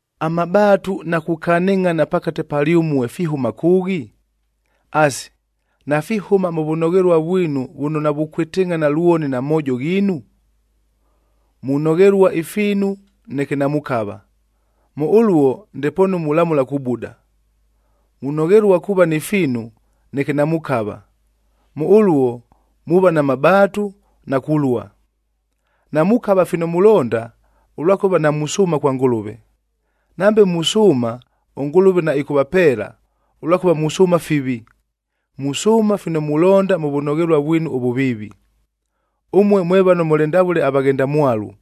Amabaatu na kukanɨngʼhana pakate palyʉmue fihʉma kʉʉghi? Asi, nafihʉma mʉ vʉnoghelua vwinu vʉno navukwɨtɨngʼhana lwoni na moojo ghiinu? Munoghelua ifiinu neke namukava. Mʉ ʉluo ndepoonu mulamʉla kubuda. Munoghelua kuuva ni fiinu, neke namukava. Mʉ ʉluo, muuva na mabaatu na kulua. Namukava fino mulonda, ʉlwakʉva namusʉʉma kwa Ngʉlʉve. Nambe musʉʉma, ʉNgʉlʉve naɨkʉvapeela, ʉlwakʉva musʉʉma fivi, musʉʉma fino mulonda mʉ vʉnoghelua vwinu ʉvʉviivi. Ʉmue mwe vano mʉlɨ ndavʉle avaghendamwalu,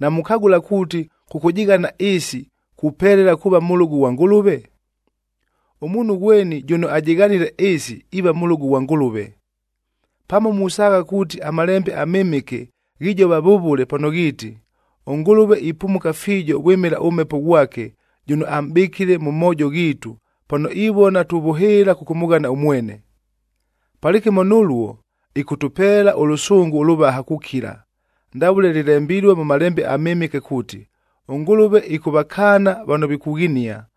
namukagʉla kuuti kʉkʉjɨghana ɨɨsi kupelela kuuva mʉlʉgʉ ghwa Ngʉlʉve? Ʉmuunhu ghweni jʉno ajɨghanile ɨɨsi iiva mʉlʉgʉ ghwa Ngʉlʉve. Pamo musaagha kuuti aMalembe aMɨmɨke ghijova vʉvʉle pano ghiiti, “ɄNgʉlʉve ipumuka fiijo vwɨmɨla ʉMhepo ghwake jʉno amʼbɨkile mʉ moojo ghiitu pano ivona tuvʉhɨɨla kʉkʉmʉghana ʉmwene.” Palɨkɨmo nʉluo, ɨkʉtʉpeela ʉlʉsʉngʉ ʉlʉvaha kukila, ndavʉle lɨlembilue mʉ Malembe aMɨmɨke kuuti, “ɄNgʉlʉve ɨkʉvakaana vano vikughinia,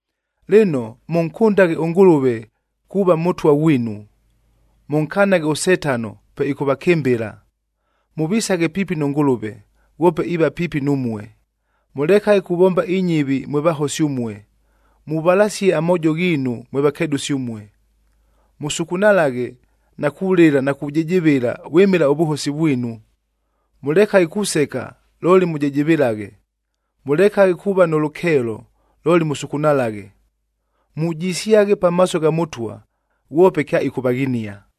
Lɨno, mʉnkʉndaghe ʉNgʉlʉve kuuva Mʉtwa ghwinu. Mʉnkanaghe ʉSetano pe ɨkʉvakɨmbɨla. Mʉvisaghe piipi nʉ Ngʉlʉve, ghwope iiva piipi numue. Mʉlekaghe kuvomba inyɨvi mwe vahosi ʉmue, muvalasie amoojo ghiinu mwe vakedʉsi ʉmue. Mʉsukunalaghe na kulɨla na kujɨjɨvɨla vwɨmɨla ʉvʉhosi vwinu. Mʉlekaghe kuseka looli mʉjɨjɨvɨlaghe, mʉlekaghe kuuva nʉ lʉkeelo, looli mʉsukunalaghe. Mujisyaghe pamaaso gha Mʉtwa, ghwope kyaɨkʉvaghinia.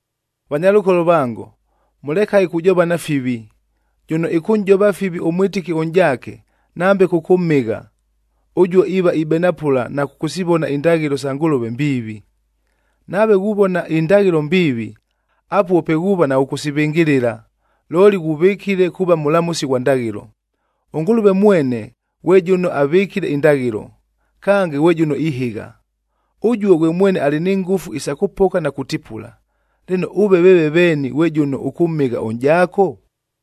Vanyalʉkolo vango, mʉlekaghe kujovana fivi. Jʉno ɨkʉnʼjova fivi ʉmwɨtɨki ʉnʼjaake nambe kʉkʉmhɨgha, ʉjuo iiva ibenapʉla na kʉkʉsivona indaghɨlo sa Ngʉlʉve mbiivi. Nave ghuvona indaghɨlo mbiivi, apuo pe ghuuva naghʉkʉsivɨngɨlɨla, looli ghuvɨkile kuuva mʉlamʉsi ghwa ndaghɨlo. ɄNgʉlʉve mwene ghwe jʉno avɨkile indaghɨlo, kange ghwe jʉno ihɨgha. Ʉjuo ghwe mwene alɨ ni ngʉfu isa kʉpoka na kutipula. Lɨno, ʉve veeve veeni ghwe jʉno ʉkʉmhɨgha ʉnʼjaako?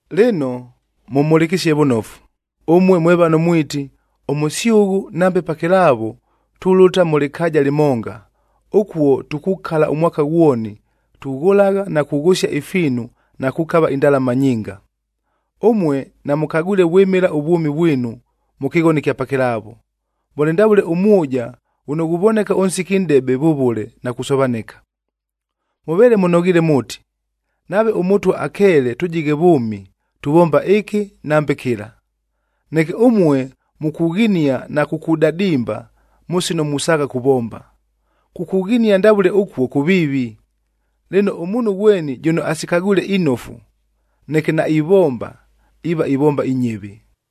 Lɨno, mʉmhʉlɨkɨsie vʉnofu, ʉmue mwe vano mwiti, “Ʉmʉsyʉghʉ nambe pakɨlaavo, tulʉta mʉ lɨkaaja lɨmonga. Ʉkuo tukukala ʉmwaka ghwoni tughʉlagha na kughʉsia ifiinu na kukava indalama nyinga.” Ʉmue namʉkagwile vwɨmɨla ʉvwʉmi vwinu mʉ kɨghono ɨkya pakɨlaavo, mʉlɨ ndavʉle ʉmwʉja ghʉno ghuvoneka ʉnsiki nʼdebe vʉvʉle na kusovanɨka. Mʉveele mʉnoghiile mʉʉti, “Nave ʉMʉtwa akeele tʉjighe vʉʉmi, tuvomba ɨkɨ nambe kɨla.” Neke ʉmue mukughinia na kukudadimba mʉ sino musaagha kuvomba. Kukughinia ndavʉle ʉkuo kʉviivi. Lɨno, ʉmuunhu ghweni jʉno asikagwile inofu, neke naivomba, iiva ivomba inyɨvi.